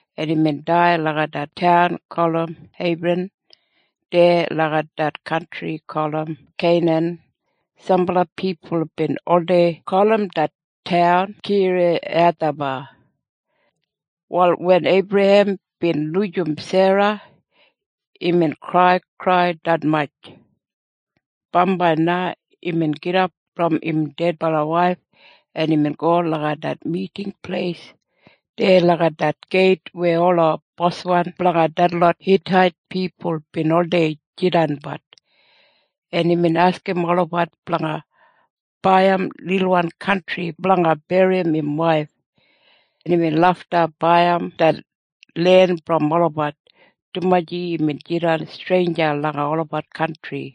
en imbin dai langa det taun gulum Hebran deya langa det kantri gulum Keinan. Sambala pipul bin oldei gulum det taun Kiriyathaba. Wal wen Eibrahem bin lujim Sera, imbin kraikrai detmatj. Bambai na imbin gidap brom im dedbala waif, en imbin go langa det miting pleis deya langa det geit weya ola boswan blanga detlot Hitait pipul bin oldei jidanbat, en imbin askim olabat blanga baiyim lilbit kantri blanga berrim im waif. Imbin lafta baiyim det len brom olabat, dumaji imbin jidan streinja langa olabat kantri.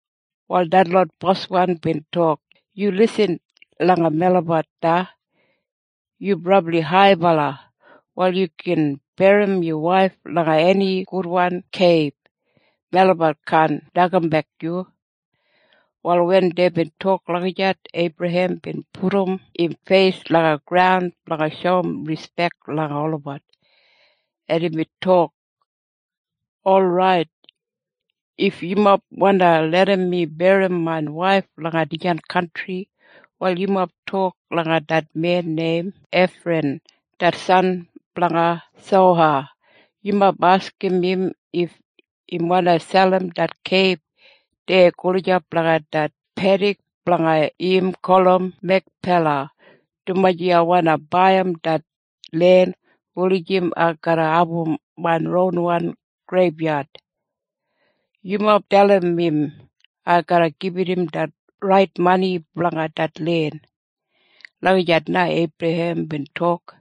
Wal detlot boswan bin tok, “Yu lisin langa melabat na. Yu brabli haibala. Wal yu gin berrim yu waif langa eni gudwan keib. Melabat kaan nokambek yu.” Wal wen deibin tok lagijat, Eibrahem bin pudum im feis langa graun blanga shoum rispek langa olabat, en imbin tok, “Orait, if yumob wandi larram mi berrim main waif langa dijan kantri, wal yumob tok langa det men neim Efran det san blanga Soha. Yumob askim im if im wandi selim det keib deya gulijap langa det pedik blanga im gulum Mekpela, dumaji ai wandi baiyim det len wulijim ai garra abum main ronwan greibyad. Yumob dalim im ai garra gibit im det rait mani blanga det len.” Lagijat na Eibrahem bin tok.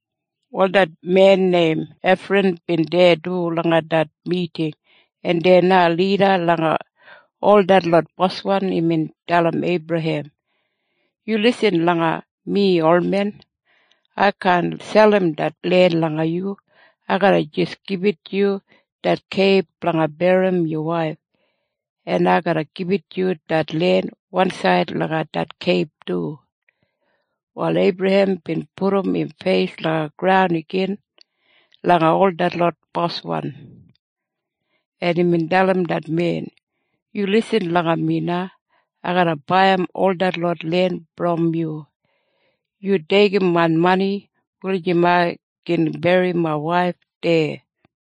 Wal det men neim Efran bin deya du langa det miting, en deya na lida langa ol detlot boswan imbin dalim Eibrahem, “Yu lisin langa mi olmen. Ai kaan selim det len langa yu. Ai garra jis gibit yu det keib blanga berrim yu waif. En ai garra gibit yu det len wansaid langa det keib du.” Wal Eibrahem bin pudum im feis langa graun igin langa ol detlot boswan, en imbin dalim det men, “Yu lisin langa mi na. Ai garra baiyim ol detlot len brom yu. Yu deigim main mani, wulijim ai gin berrim main waif deya.”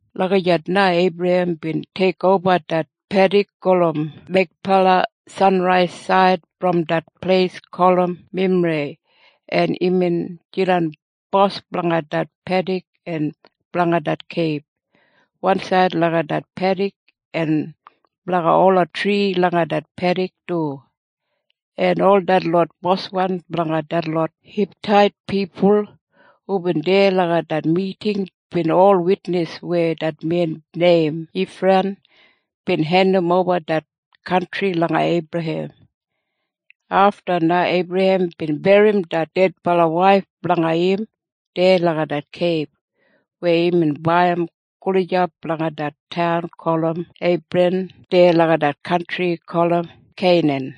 Lagijat na Eibrahem bin teikoba det pedik gulum Mekpela sanraisaid brom det pleis gulum Memrei, en imbin jidan bos blanga det pedik en blanga det keib wansaid langa det pedik en blanga ola tri langa det pedik du, en ol detlot boswan blanga detlot Hitait pipul hubin deya langa det miting bin ol witnis weya det men neim Ifran bin hendimoba det kantri langa Eibrahem. Afta na Eibrahem bin berrim det dedbala waif blanga im deya langa det keib weya imbin baiyim gulijap langa det taun gulum Hebran deya langa det kantri gulum Keinan.